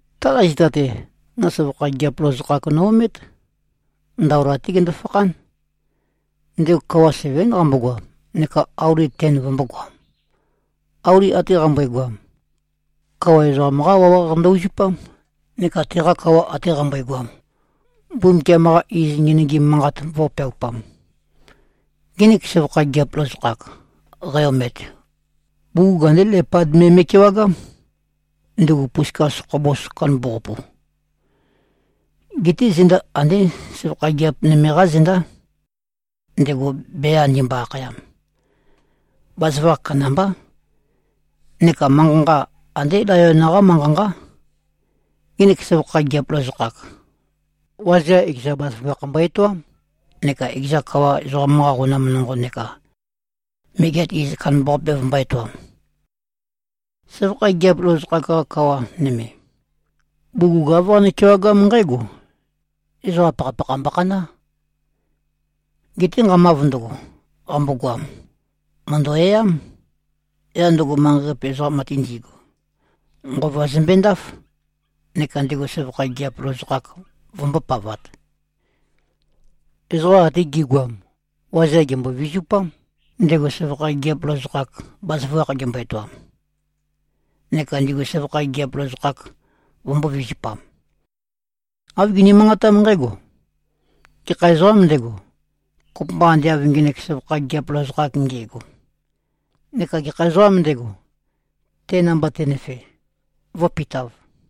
Taqa zita-te, no søvakha gigiap lozokhak no-omét. Ndaola-té gendo-fakhán. Ndego kawa sevén qambogoam neka auli ten vømbōgoam. Auli ate qambøegoam, kawa ezoqam-qá wawaq ndø-uzupám, neka teqa kawa ate qambøegoam, Mbumbukiam-qa iz ngenøgim manqat vō꞉peaupam. Ngenek søvakha gigiap lozokhak, qæ-omet, bugug andé lepad me me꞉kewagám, ndugu puskas khobos kandambaqapu. Geté zenda andé søvakha gigiap nøme-qá zendá, ndego bea ndimbo-akhayam. Bazaføgakh kandambá. Neka manqa-nqa, andé layon-qá manqa-nqá. Ngenek søvakha gigiap lozokhak, wazeam ekeza bazaføgakh mbo-etoám neka ekeza kawa ezoqam-qa qonam nonqo neka megeat iz kandambaqape vømbō-etoam. Søvakha gigiap lozokhak-qa kawa nøme, bugug āv qane-kewagám nqǽgo: Ezoqa pakhapakha mbokhaná. Geté nqamav ndøgo, qambogoam, mø̀ndø-e꞉ám. Yaq ndøgo, manqei-qape ezoqam ate ndigu, nqova zømbendáf, neka ndego søvakha gigiap lozokhak vømbōpavat. Ezoqa ate gi꞉goam, wazeam gèmbo-vizupám, ndego søvakha gigiap lozokhak, bazaføgakh gembøe-etoam. Neka ndigu søvakha gigiap lozokhak, vømbō-vizupam. Āv gini-manqatám nqǽgo, “Gekha ezoqâm ndego, kopømba ande av ngenek søvakha gigiap lozokhak nde꞉go? Neka gekha ezoqâm ndego, te namba tenøfe, vǿpitāv?”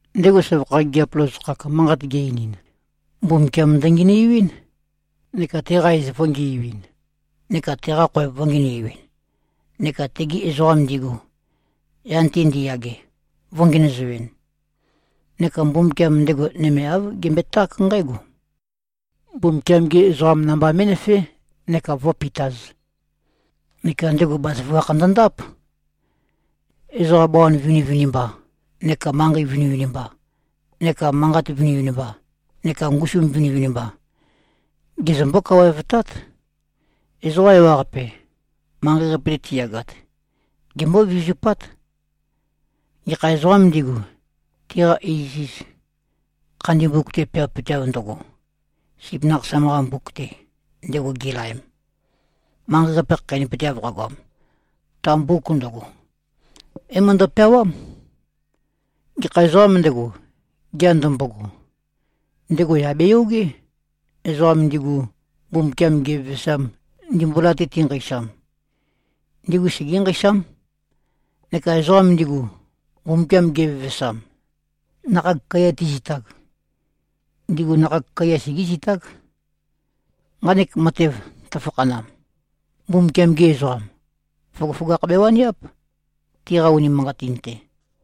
Ndego søvakha gigiap lozokhak manqat ge-einin, Mbumbukiam ndøngenøiuín, neka teqa iz vø̄ngiuin neka teqa khoev vø̄ngenøiuin neka tegi ezoqam ndigu, yan-te ndiyage, vø̄ngenøzoin. Neka Mbumbukiam ndego nøme āv gembøeták nqǽgo: Mbumbukiam-gi ezoqam namba mé꞉nøfé neka vǿpitāz. Neka ndego bazaføgakh ndøndáp. Ezoqa bawan vinivinimba neka manqei vinivinimba neka manqat vinivinimba neka ngusu vinivinimba gezømbó-kawaevtát. Ezoqa ewaqape, manqei-qape-te tiyagat, gembó-vizupát, gekha ezoqām ndigu, tiqa iziz khandi mbuk-te peawapøteav ndøgo, Sip Nakhasam-qa mbuk-te, ndego gilaem. Manqei-qape khakheinøpøteav qagoam, ta mbuk ndøgo, é-møndo-peawám. Gekha ezoqām ndego, gea ndømbogo, ndego yà beyogé. Ezoqa ndigu, Mbumbukiam gevevesam, ndimbula-te tinqeisam, ndigu segé-nqeisám. Neka ezoqam ndigu, Mbumbukiam gevevesam, nakhag kaiya ti꞉zitag, ndigu nakhag kaiya segé꞉zitág. Nqanek matev tøfakhanam, Mbumbukiam-gi ezoqam, føgøføgakh bewaniáp, tiqa unimanqatin-te.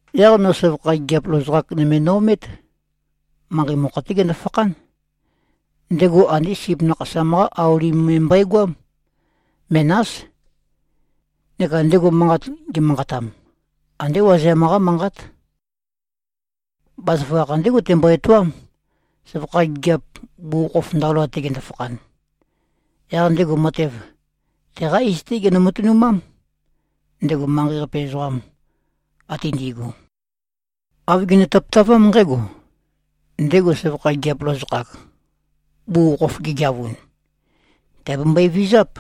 Yaq no søvakha gigiap lozokhak nøme no-omét. Manqei mokho-té gendo-fakhán. Ndego andé sip nakhasam-qá auli me mbøegoám. Menás. Neka ndego manqat gemanqatam, andé wazeam-qá manqát. Bazaføgakh ndégo tembo-etoám, søvakha gigiap, bugukhokhof ndaola-te gendo-fakhan. Yaq ndego matev, teqá iz-té genø-matønumám. Ndego manqei-qape ezoqam ate ndi꞉gu, āv gene-tøpøtavám nqǽgo: Ndego søvakha gigiap lozokhak, bugukhokhof gegeavun, tìabembøe-vizáp,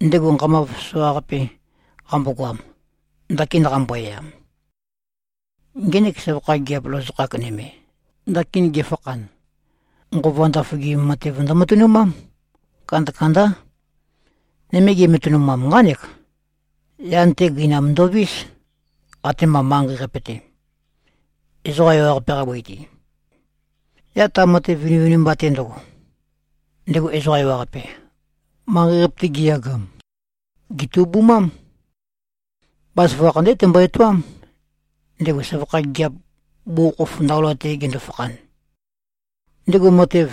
ndego nqamav soqaqape qambogoam, ndakin qambo-e꞉am. Ngenek søvakha gigiap lozokhak nøme, ndakin gefakhan, nqova ndaføgim matev ndømatønumám. Kandakandá. Nøme gematanam, nqánek: Yan-te gøinam ndovís, atema manqei-qape-te, ezoqa ewaqape-qa bøi-te. Yaq ta matev vinivinimba-te ndøgo, ndego ezoqa ewaqape, manqei-qape-te giyagam, gètubumám. Bazaføgakh ndégo tembo-etoám, ndego søvakha gigiap, bugukhokhof ndaola-te gendo-fakhan. Ndego matev,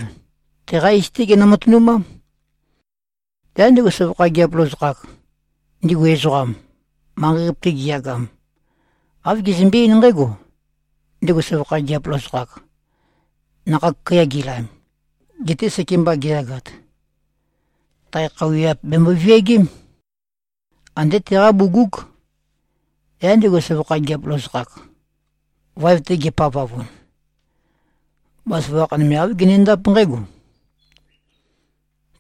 teqá iz-té genø-matønumám. Yaq ndego søvakha gigiap lozokhak, ndigu ezoqam, manqei-qape-te giyagam, āv gezømbe-eín nqǽgo: Ndego søvakha gigiap lozokhak, nakhag kaiya gi꞉laem, gete sekemba geyagat, tae khøuwiap bèmbo-viagém. Andé teqá bugúg. Yaq ndego søvakha gigiap lozokhak, vaev-te gepavavun, bazaføgakh nøme, āv genendáp nqǽgo: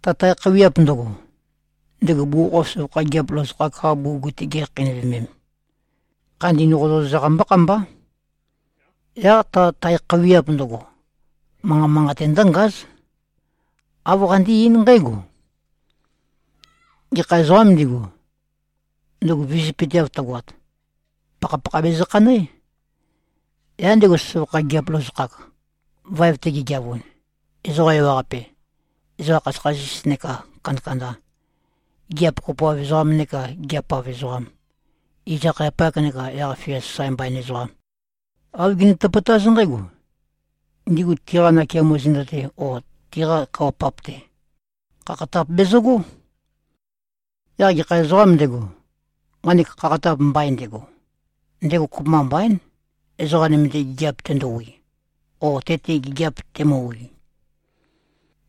Ta tae khøuwiap ndøgo, ndego bugukhokhof søvakha gigiap lozokhak-qa bugug-te gikhakheinøvemem, khandin qozøqozaq mbókhambá. Yaq ta tae khøuwiap ndøgo, manqa manqate ndǿngáz. Āv qandé-eín nqǽgo: Gekha ezoqām ndigu, ndøgo vizøpøteav tøgoat, pakhapakha bezø-khanøé. Yaq ndego søvakha gigiap lozokhak, vaev-te gegeavun, ezoqa ewaqape, ezoqa khasøkhasis nekā kandakanda, gigiap kopoav ezoqam nekā gigiap-av ezoqam, iz-akhayapak nekā yaq-fia mbain sasae ezoqam, āv gene-tøpøtáz nqǽgo: Ndigu tiqa nakeamo zenda-te o tiqa kawa-pap-te, khakhatap bezøgó. Yaq gekha ezoqām ndego, nqanek khakhatap mbain ndego, ndego kopømba mbaín, ezoqa nøme-te gigiap tendowi, o te-te gigiap temøwi.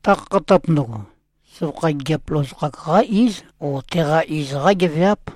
Ta khakhatap ndøgo, søvakha gigiap lozokhak-qá íz o teqa iz-qá geveáp.